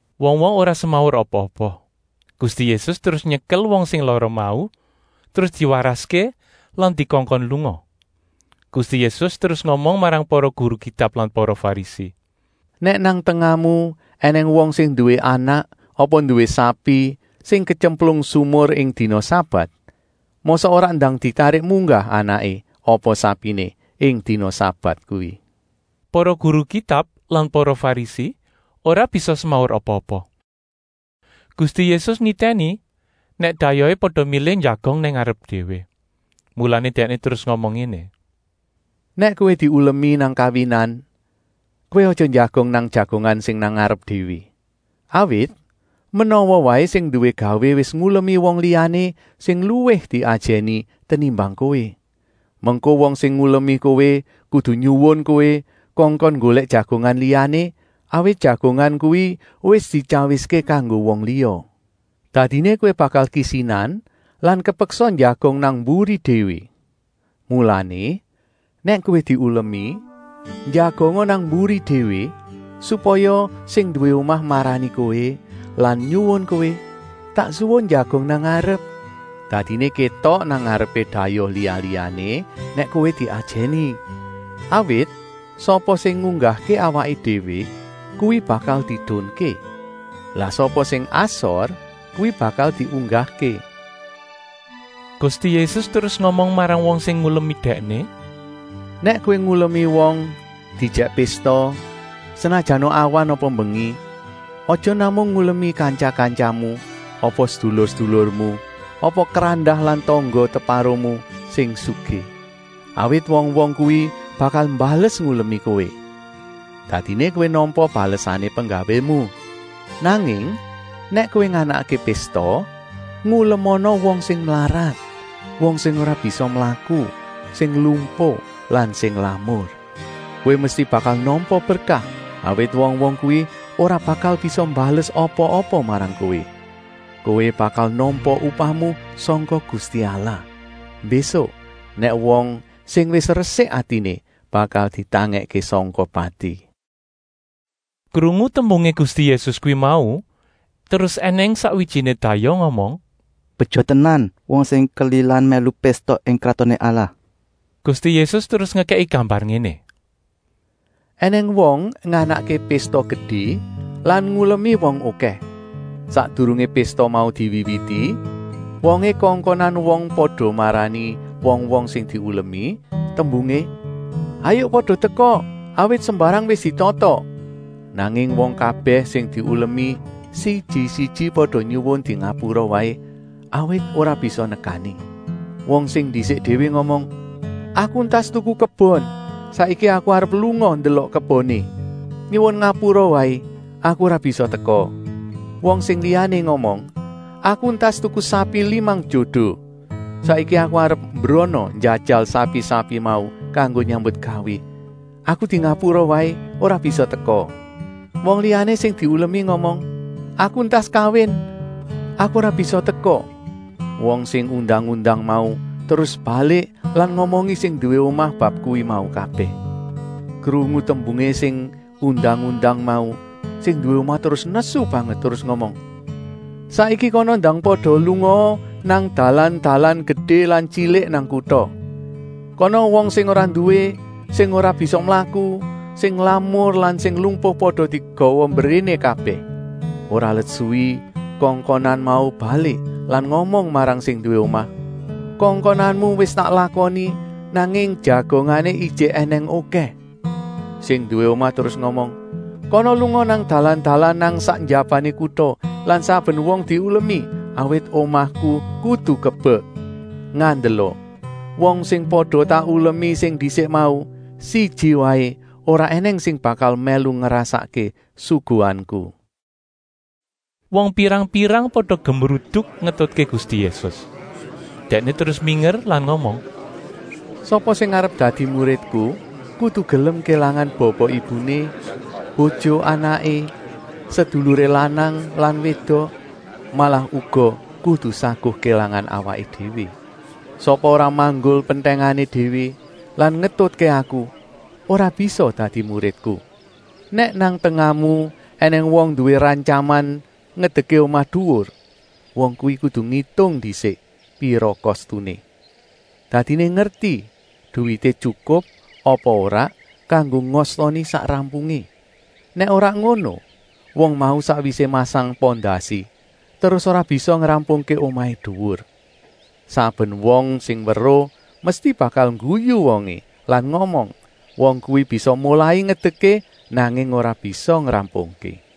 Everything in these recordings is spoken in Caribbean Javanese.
Wong-wong ora semaur apa-apa. Gusti Yésus terus nyekel wong sing lara mau, terus diwaraské lan dikongkon lunga. Gusti Yésus terus ngomong marang para guru Kitab lan para Farisi: “Nèk nang tengahmu ènèng wong sing nduwé anak apa nduwé sapi sing ketyemplung sumur ing dina sabat, mosok ora ndang ditarik munggah anaké apa sapiné ing dina sabat kuwi?” Para guru Kitab lan para Farisi ora bisa semaur apa-apa. Gusti Yésus nitèni nèk dayohé pada milih njagong nang ngarep déwé. Mulané Dèkné terus ngomong ngéné: “Nèk kowé diulemi nang kawinan, kowé aja njagong nang jagongan sing nang ngarep déwé. Awit menawa waé sing nduwé gawé wis ngulemi wong liyané sing luwih diajèni tenimbang kowé. Mengko wong sing ngulemi kowé kudu nyuwun kowé kongkon nggolèk jagongan liyané, awit jagongan kuwi wis dityawiské kanggo wong liya. Dadiné kowé bakal kisinan lan kepeksa njagong nang mburi déwé. Mulané, nèk kowé diulemi, njagonga nang mburi déwé, supaya sing nduwé omah marani kowé lan nyuwun kowé: ‘Tak suwun njagong nang ngarep.’ Dadiné kétok nang ngarepé dayoh liya-liyané nèk kowé diajèni. Awit sapa sing ngunggahké awaké déwé, kuwi bakal diedunké. Lah sapa sing asor, kuwi bakal diunggahké.” Gusti Yésus terus ngomong marang wong sing ngulemi Dèkné: “Nèk kowé ngulemi wong diejèk pésta, senajana awan apa mbengi, aja namung ngulemi kantya-kantyamu apa sedulur-sedulurmu, apa krandah lan tangga-teparomu sing sugih. Awit wong-wong kuwi bakal mbales ngulemi kowé. Dadiné kowé nampa balesané penggawému. Nanging nèk kowé nganakké pésta, ngulemana wong sing mlarat, wong sing ora bisa mlaku, sing lumpuh lan sing lamur. Kowé mesti bakal nampa berkah, awit wong-wong kuwi ora bakal bisa mbales apa-apa marang kowé. Kowé bakal nampa upahmu sangka Gusti Allah, mbésuk nèk wong sing wis resik atiné bakal ditangèkké sangka pati.” Krungu tembungé Gusti Yésus kuwi mau, terus ènèng sakwijiné dayoh ngomong: “Beja tenan wong sing kelilan mèlu pésta ing Kratoné Allah!” Gusti Yésus terus ngekèki gambar ngéné: “Enèng wong nganakké pésta gedé lan ngulemi wong okèh. Sakdurungé pésta mau diwiwiti, wongé kongkonan wong pada marani wong-wong sing diulemi, tembungé: ‘Hayuk pada teka, awit sembarang wis ditata.’ Nanging wong kabèh sing diulemi siji-siji pada nyuwun dingapura waé, awit ora bisa nekani. Wong sing ndisik déwé ngomong: ‘Aku entas tuku kebon. Saiki aku arep lunga ndelok keboné. Nyuwun ngapura waé, aku ora bisa teka.’ Wong sing liyané ngomong: ‘Aku entas tuku sapi limang jodo. Saiki aku arep mbrana njajal sapi-sapi mau kanggo nyambutgawé. Aku dingapura waé, ora bisa teka.’ Wong liyané sing diulemi ngomong: ‘Aku entas kawin, aku ora bisa teka.’ “Wong sing undang-undang mau terus balik lan ngomongi sing nduwé omah bab kuwi mau kabèh. Krungu tembungé sing undang-undang mau sing nduwé omah terus nesu banget, terus ngomong: ‘Saiki kana ndang pada lungaa nang dalan-dalan gedé lan tyilik nang kuta. Kana wong sing ora nduwé, sing ora bisa mlaku, sing lamur lan sing lumpuh pada digawa mbréné kabèh.’ Ora let suwi kongkonan mau balik lan ngomong marang sing nduwé omah: ‘Kongkonanmu wis tak lakoni, nanging jagongané ijik ènèng okèh.’ Sing nduwé omah terus ngomong: ‘Kana lunga nang dalan-dalan nang sak njabané kuta lan saben wong diulemi, awit omahku kudu kebek. Ngandela, wong sing pada tak ulemi sing ndisik mau, siji waé ora ènèng sing bakal mèlu ngrasakké suguhanku.’” Wong pirang-pirang pada gemruduk ngetutké Gusti Yésus. Dèkné terus minger lan ngomong: “Sapa sing arep dadi muridku kudu gelem kélangan bapa-ibuné, bojo-anaké, seduluré lanang lan wédok, malah uga kudu saguh kélangan awaké déwé. Sapa ora manggul pentèngané déwé lan ngetutké Aku, ora bisa dadi muridku. “Nèk nang tengahmu ènèng wong nduwé rantyaman ngedekké omah duwur, wong kuwi kudu ngitung ndisik pira kostuné. Dadiné ngerti, duwité tyukup apa ora kanggo ngostoni sak rampungé. Nèk ora ngono, wong mau sakwisé masang pondasi, terus ora bisa ngrampungké omahé duwur. Saben wong sing weruh mesti bakal ngguyu wongé lan ngomong: ‘Wong kuwi bisa molai ngedekké, nanging ora bisa ngrampungké.’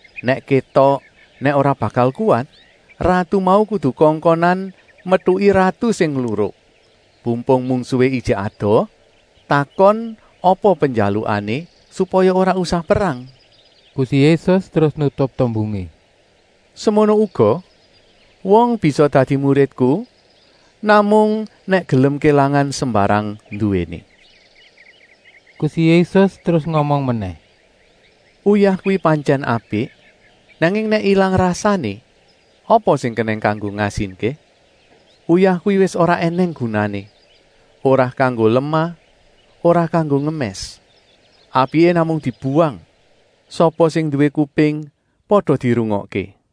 Nèk kétok nèk ora bakal kuwat, ratu mau kudu kongkonan metuki ratu sing ngluruk. Pumpung mungsuhé ijik adoh, takon apa penjalukané, supaya ora usah perang.” Gusti Yésus terus nutup tembungé: “Semono uga wong bisa dadi muridku, namung nèk gelem kélangan sembarang nduwéné.” Gusti Yésus terus ngomong menèh: “Uyah kuwi pantyèn apik, nanging nèk ilang rasané, apa sing kenèng kanggo ngasinké? Uyah kuwi wis ora ènèng gunané, ora kanggo lemah, ora kanggo ngemès. Apiké namung dibuwang. Sapa sing nduwé kuping, pada dirungokké!”